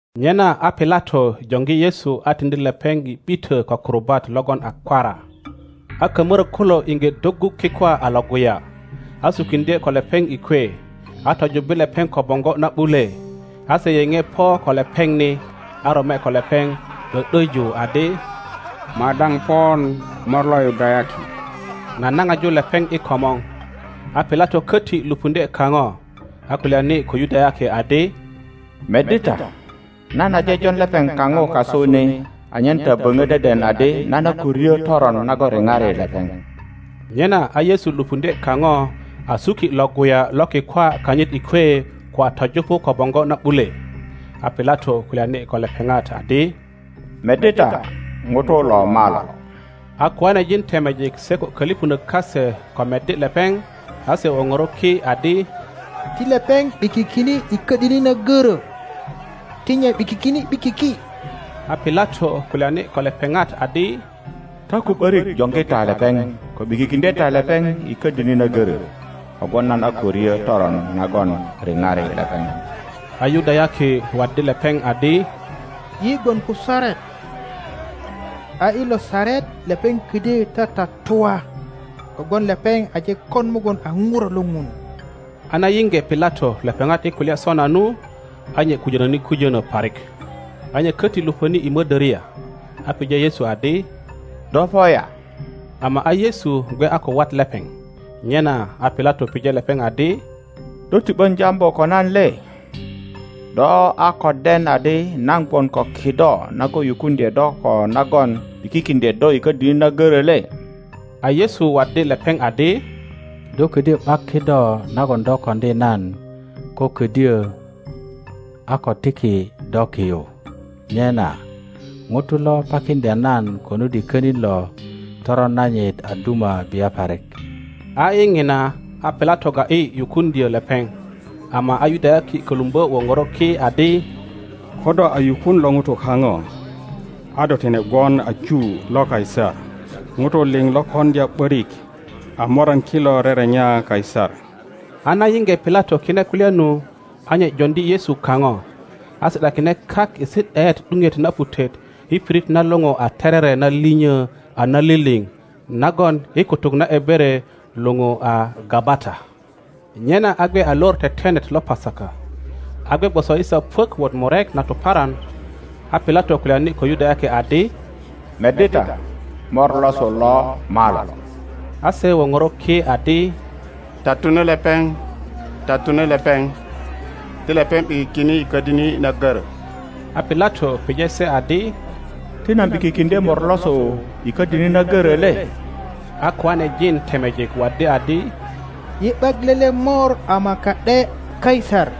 Nyena a Pilato joŋgi Yesu a tiŋdi lepeŋ i ’bitö ko kurubat logon a kwara, a kamorök kulo iŋge doggu kikwa a Iŋguya, a sukiŋdye ko lepeŋ i kwe, a tojubbi lepeŋ ko boŋgo na ’bule. A se yeŋe po ko lepeŋ ni, a rome ko lepeŋ ’dö ’döju adi, Madaŋ pon mor lo Yudayaki! nanaŋaju lepeŋ i komor. A Pilato köti lupuŋdye kaŋo, a kulyani ko Yudayaki adi, Meddi ta, nan aje jon lepeŋ kaŋo kasu ni anyen ta boŋö deden adi nan a ko ryo toron nagon riŋari lepeŋ. Nyena a Yesu lupuŋdye kaŋo a suki Iŋguya lo kikwa kanyit i kwe ko a töjupu ko boŋgo na ’bule. A Pilato kulyani ko lepeŋat adi, Meddi ta, ŋuto lo malo. A koanejin temejik se ko kölipönök kase ko meddi lepeŋ, a se woŋoro ki adi, Ti lepeŋ ’bikikine i ködini na görö! Ti nye ’bikikine ’bikiki! A Pilato kulyani ko lepeŋat adi, Ta ko ’börik joŋgi ta lepeŋ ko ’bikikiŋdye ta lepeŋ i ködini na gorö; kogwon nan a ko ryo toron nagon riŋari lepeŋ. A Yudayaki waddi lepeŋ adi, Yi gwon ko saret, a i lo saret lepeŋ ködyö tatatua kogwon lepeŋ aje kon mugun a Ŋuro lo Ŋun. a na yiŋge Pilato lepeŋat i kulya sona nu, a nye kujönöni kujönö parik, a nye köti lupöni i mödöria, a pije Yesu adi, Do po ya? Ama a Yesu gwe a ko wat lepeŋ. Nyena a Pilato pije lepeŋ adi, Do ti ’bön jambu ko nan le? Do a ko den adi nan gwon ko kido nagon yukuŋdye do ko nagon ’bikikiŋdye do i ködini na goro le? A Yesu waddi lepeŋ adi, Do ködyo ’bak kido nagon do koŋdi nan ko ködyö a ko tiki do ki yu, nyena ŋuto lo pakiŋdya nan konut i könin lo toron nanyit a duma bia parik, A i ŋina a Pilato ga ’yi yukuŋdyö lepeŋ, ama a Yudayaki kölumbö woŋoro ki adi, Ko do a yukun lo ŋuto kaŋo, a do tine gwon a ju lo Kaisar, Ŋutu liŋ lo koŋdya ’börik a moran kilo rerenya Kaisar. A na yiŋge Pilato kine kulya nu, a nye joŋdi Yesu kaŋo, a si ’dakine kak i si ’daet ’duŋet na putet i pirit na luŋu a Terere na linyo a naliliŋ nagon i kutuk na Ebere luŋu a Gabata. Nyena a gwe a Lor Tetenet lo Pasaka, a gwe gwoso i saa puök wot murek na tuparan. A Pilato kulyani ko Yudayaki adi, Meddi ta, mor losu lo malo! A se woŋoro ki adi, Tatune lepeŋ, tatune lepeŋ, ti lepeŋ ’bikikine i ködini na görö! A Pilato pije se adi, Ti nan ’bikikiŋdye mor losu i ködini na görö le? A koanejin temejik waddi adi, Yi ’bak lele mor ama ka ’de Kaisar.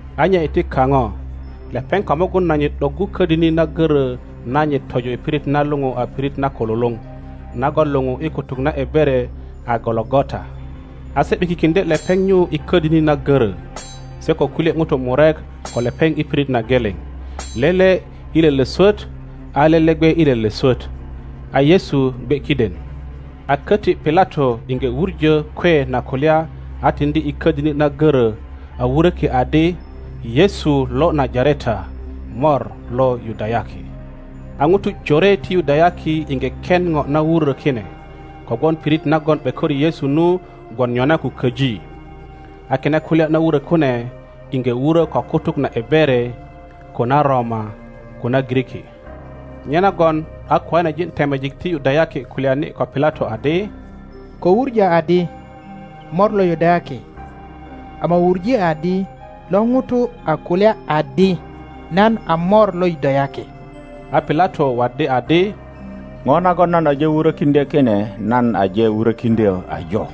a nye iti kaŋo, lepeŋ ko mugun nanyit ’doggu ködini na görö nanyit tojo i pirit na luŋu a Pirit na Kululuŋ, nagon luŋu i kutuk na Ebere a Gologota. A se ’bikikiŋdye lepeŋ nyu i ködini na görö, se ko kulye ŋutu murek ko lepeŋ i pirit na geleŋ, lele i lele swöt a lele gwe i lele swöt, a Yesu gwe kiden. A köti Pilato iŋge wuŋo kwe na kulya a tiŋdi i ködini na görö. A wuröki adi: YESU LO NAJARETA, MOR LO YUDAYAKI. A ŋutu jore ti Yudayaki iŋge ken ŋo na wurö kine, kogwon pirit nagon ’bekori Yesu nu gwon nyona ko köji. A kine kulya na wuro kune iŋge wurö ko kutuk na Ebere, ko na Roma, ko na Giriki. Nyenagon a koanejin temejik ti Yudayaki kulyani ko Pilato adi, Ko wuŋö adi, Mor lo Yudayaki, ama wuŋe adi, Lo ŋuto a kulya adi, Nan a Mor lo Yudayaki. a Pilato waddi adi, Ŋo nagon nan aje wurökiŋdyö kine nan aje wurökiŋdyö ajo.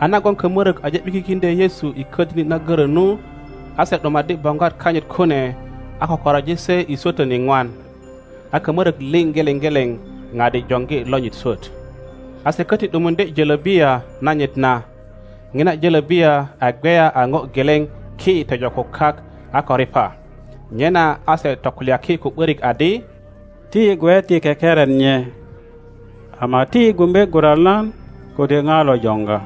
A nagon kamörök aje ’bikikiŋdyö Yesu i ködini na görö nu, a se ’dumaddi boŋgwat kanyit kune, a kökoroji se i swötön iŋwan. A kamörök liŋ geleŋ geleŋ ŋadi joŋgi lonyit swöt. A se köti ’dumuŋdye jölöbiya nanyit na. Ŋina jölöbiya a gweya a ŋo geleŋ ki tojo ko kak a ko riŋa. Nyena a se tokulyaki ko ’börik adi, Ti yi gwe ti kekeren nye, ama ti yi gumbe guralan kode ŋa lo joŋga.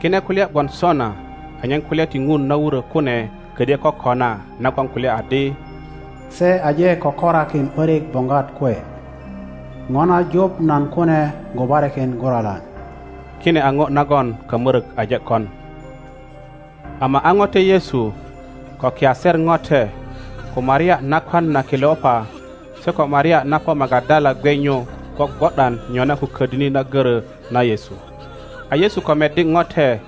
Kine kulya gwon sona anyen kulya ti Ŋun na wurö kune ködyö kokona nagon kulya adi, Se aje kökorakin ’börik boŋgwat kwe, ŋo na juŋ nan kune gubarikin guralan. Kine a ŋo nagon kamörök aje kon. Ama a ŋote Yesu, ko kiaser ŋote, ko Maria nakwan na Keleopa, se ko Maria na po Magadala gwe nyu gwogwo ’dan nyona ko ködini na görö na Yesu. A Yesu ko meddi ŋote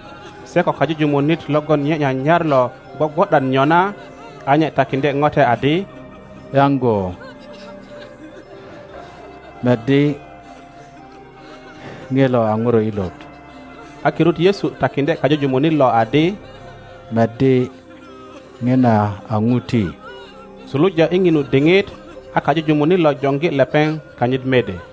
se ko kajujumunit logon nye nyanyar lo gwogwo ’dan nyona, a nye takiŋdye ŋote adi, Yaŋgo, meddi, ŋilo a ŋuro ilot. a kirut Yesu takiŋdye kajujumunit lo adi, Meddi, ŋina a ŋuti. Suluja i ŋinu diŋit a kajujumunit lo joŋgi lepeŋ kanyit mede.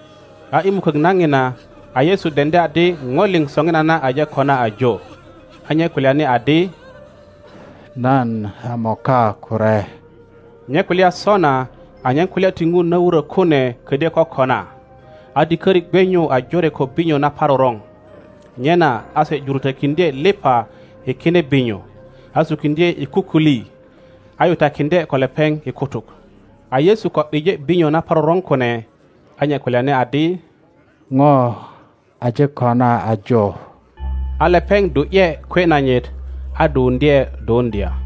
A i mukök na ŋina, a Yesu deŋdi adi ŋo liŋ soŋinana aje kona ajo. A nye kulyani adi, Nan a moka kure. (Nye kulya sona anyen kulya ti Ŋun na wurö kune ködyö kokona.) a diköri gwe nyu a jore ko binyo naparoroŋ. Nyena a se jurutökiŋdye liŋa i kine binyo, a sukiŋdye i kukuli, a yutakiŋdye ko lepeŋ i kutuk. a Yesu ko ’bije binyo naparoroŋ kune, a nye kulyani adi, Ŋo aje kona ajo! A lepeŋ du ’ye kwe nanyit a duwuŋdye duwuŋdya.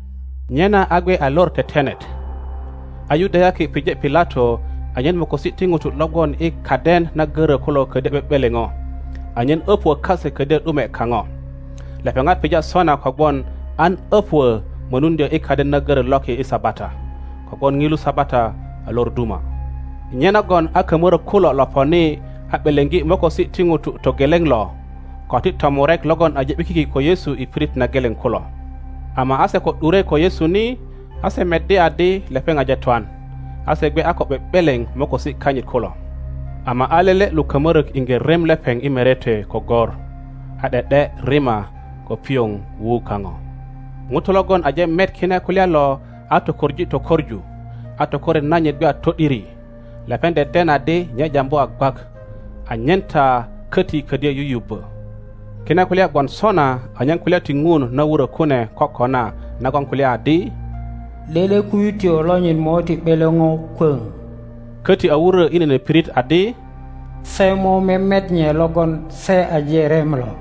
Nyena a gwe a Lor Tetenet. A Yudayaki pije Pilato anyen mokosi ti ŋutu lo gwon i kaden na görö kulo ködyö ’be ’beleŋo, anyen öpuö kase ködyö ’dumwe kaŋo. Lepeŋat pija sona kogwon an öpuö mönuŋdyö i kaden na görö loki i Sabata, kogwon ŋilu Sabata a lor duma. Nyenagon a kamörök kulo lo poni a ’beleŋgi mokosi ti ŋuto togeleŋ lo, ko ti tomurek logon aje ’bikiki ko Yesu i pirit na geleŋ kulo. Ama a se ko ’dure ko Yesu ni, a se meddi adi lepeŋ aje twan, a se gwe a ko ’be ’beleŋ mokosi kanyit kulo, ama a lele lo kamörök iŋge rem lepeŋ i merete ko gor, a ’de ’de rima ko pioŋ wuu kaŋo. ŋuto logon aje met kine kulya lo a tokoŋ tokoŋu, a tokoret nanyit gwe a to ’diri; lepeŋ deden adi nye jambu a gwak, anyen ta köti ködyö yuyubbö. Kine kulya gwon sona anyen kulya ti Ŋun na wurö kune kokona nagon kulya adi, Lele kuyutyo lonyit mo ti ’beleŋo kwöŋ. Köti a wurö i nene pirit adi, Se mo memet nye logon se aje rem lo.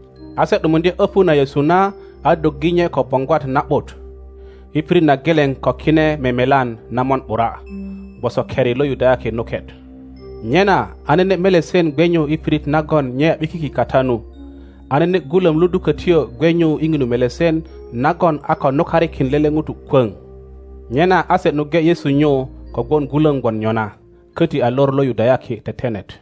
a se ’dumuŋdye öpu na Yesu na a doggi nye ko boŋgwat na ’but, i pirit na geleŋ ko kine memelan na mon ’bura, gwoso keri lo Yudayaki nuket. Nyena a nene melesen gwe nyu i pirit nagon nye a ’bikiki kata nu, a nene gulöm ludukötyo gwe nyu i ŋinu melesen nagon a ko nukarikin lele ŋuto kwöŋ. Nyena a se nuŋge Yesu nyu kogwon gulöm gwon nyona, köti a lor lo Yudayaki Tetenet.